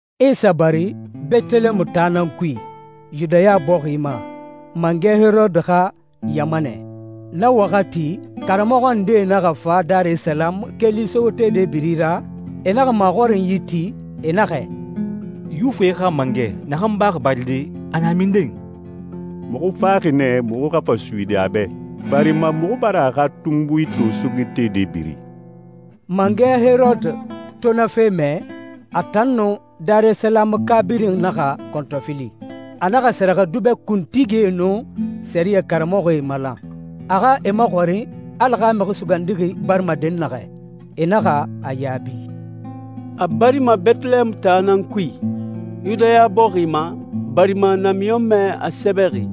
Isa bari Bɛtɛlɛɛmu taa nan kui, Yudaya bɔxi ma, mangɛ Herode xa ɲamanɛ. Na waxati, karamɔxɔ ndee naxa fa Darisalamu keli sogetede biri ra, e naxa maxɔrinyi ti, e naxɛ, «Yuwifie xa mangɛ naxan baxi baride, a na minden? Muxu faxi nɛ muxu xa fa suyidi a bɛ, barima muxu bara a xa tunbui to sogetede biri.» Mangɛ Herode to na fe mɛ, a tan nun Darisalamuka birin naxa kɔntɔfili. A naxa sɛrɛxɛdubɛ kuntigie nun sɛriyɛ karamɔxɔe malan, a xa e maxɔrin Ala xa Mixi Sugandixi barima dɛnnaxɛ. E naxa a yaabi, «A barima Bɛtɛlɛɛmu taa nan kui, Yudaya bɔxi ma, barima namiɲɔnmɛ a sɛbɛxi,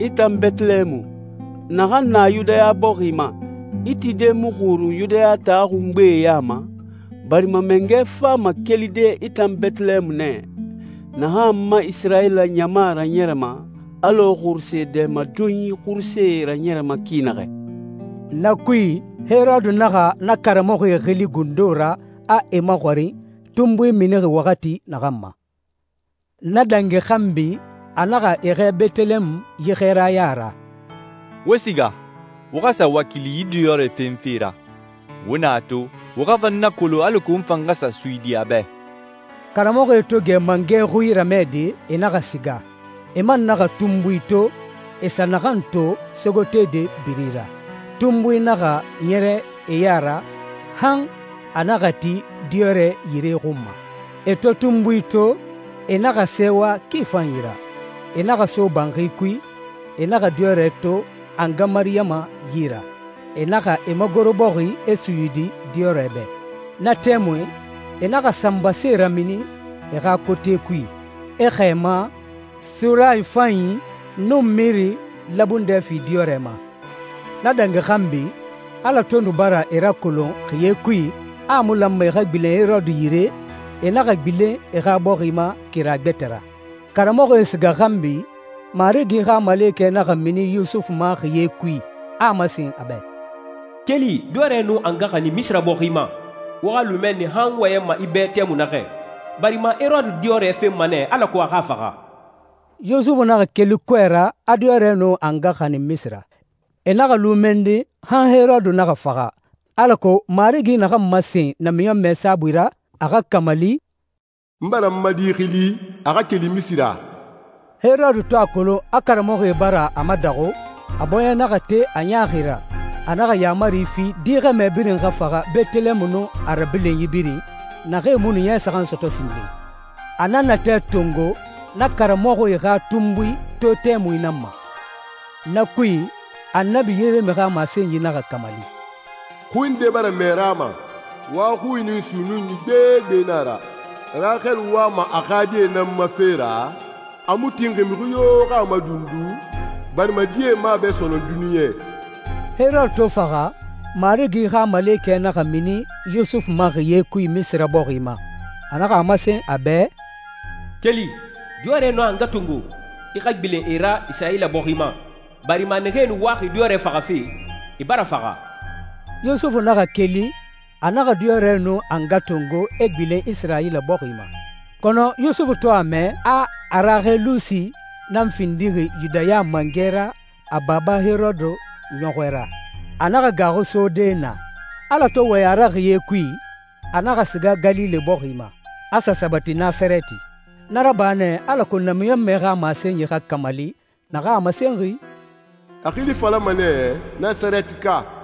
‹I tan Bɛtɛlɛɛmu, naxan na Yudaya bɔxi ma, i tide mu xurun Yudaya taa xungbee ya ma, barima mangɛ fama kelide i tan Bɛtɛlɛɛmu nɛ, naxan n ma Isirayila ɲama raɲɛrɛma, alɔ xuruse dɛmadonyi xurusee raɲɛrɛma ki naxɛ.›» Na kui, Herode naxa na karamɔxɔe xili gundo ra, a e maxɔrin tunbui minixi waxati naxan ma. Na dangi xanbi, a naxa e xɛɛ Bɛtɛlɛɛmu yi xɛɛraya ra, «Wo siga, wo xa sa wakili yi diyɔrɛ fenfe ra. Wo na a to, wo xa fa n nakolon alako n fan xa sa suyidi a bɛ.» Karamɔxɔe to gɛ mangɛ xui ramɛde, e naxa siga. E man naxa tunbui to, e sa naxan to sogetede biri ra. Tunbui naxa ɲɛrɛ e ya ra han a naxa ti diyɔrɛ yire xun ma. E to tunbui to, e naxa sɛɛwa ki fanyi ra. E naxa so banxi kui, e naxa diyɔrɛ to a nga Mariyama yi ra. E naxa e magoro bɔxi, e suyidi diyɔrɛ bɛ. Na tɛmui, e naxa sanbasee ramini e xa kote kui, e xɛɛma, surayi fanyi, nun miri labundɛ fi diyɔrɛ ma. Na dangi xanbi, Ala to nu bara e rakolon xiye kui a a mu lanma e xa gbilen Herode yire, e naxa gbilen e xa bɔxi ma kira gbɛtɛ ra. Karamɔxɔe siga xanbi, Marigi xa malekɛ naxa mini Yusufu ma xiye kui, a a masen a bɛ, «Keli. Diyɔrɛ nun a nga xanin Misira bɔxi ma. Wo xa lu mɛnni han n wɔyɛnma i bɛ tɛmui naxɛ, barima Herode diyɔrɛ fenma nɛ alako a xa a faxa.» Yusufu naxa keli kɔɛ ra, a diyɔrɛ nun a nga xanin Misira. E naxa lu mɛnni han Herode naxa faxa, alako Marigi naxan masen namiɲɔnmɛ saabui ra, a xa kamali, «N bara n ma di xili, a xa keli Misira.» Herode to a kolon a karamɔxɔe bara a madaxu, a bɔɲɛ naxa te a ɲaaxi ra. A naxa yaamari fi, di xɛmɛ birin xa faxa Bɛtɛlɛɛmu nun a rabilinyi birin, naxee mu nu ɲɛ saxan sɔtɔ sinden. A na natɛ tongo na karamɔxɔe xa tunbui to tɛmui nan ma. Na kui, Annabi Yeremi xa masenyi naxa kamali, «Xui nde bara mɛ Rama, wa xui nun sunnunyi gbegbe na a ra. Raxele wama a xa die nan ma fe ra, a mu tinxi mixi yo xa a madundu barima die mu a bɛ sɔnɔn duniɲɛ.» Herode to faxa, Marigi xa malekɛ naxa mini Yusufu ma xiye kui Misira bɔxi ma. A naxa a masen a bɛ, «Keli, diyɔrɛ nun a nga tongo, i xa gbilen e ra Isirayila bɔxi ma, barima naxee nu waxi diyɔrɛ faxafe, e bara faxa.» Yusufu naxa keli, a naxa diyɔrɛ nun a nga tongo, e gbilen Isirayila bɔxi ma. Kɔnɔ Yusufu to a mɛ a Araxelusi nan findixi Yudaya mangɛ ra a baba Herode ɲɔxɔɛ ra, a naxa gaaxu sode naa. Ala to wɔyɛn a ra xiye kui, a naxa siga Galile bɔxi ma, a sa sabati Nasarɛti. Na raba nɛ alako namiɲɔnmɛe xa masenyi xa kamali, naxan a masenxi, «A xili falama nɛ, ‹Nasarɛtika.›»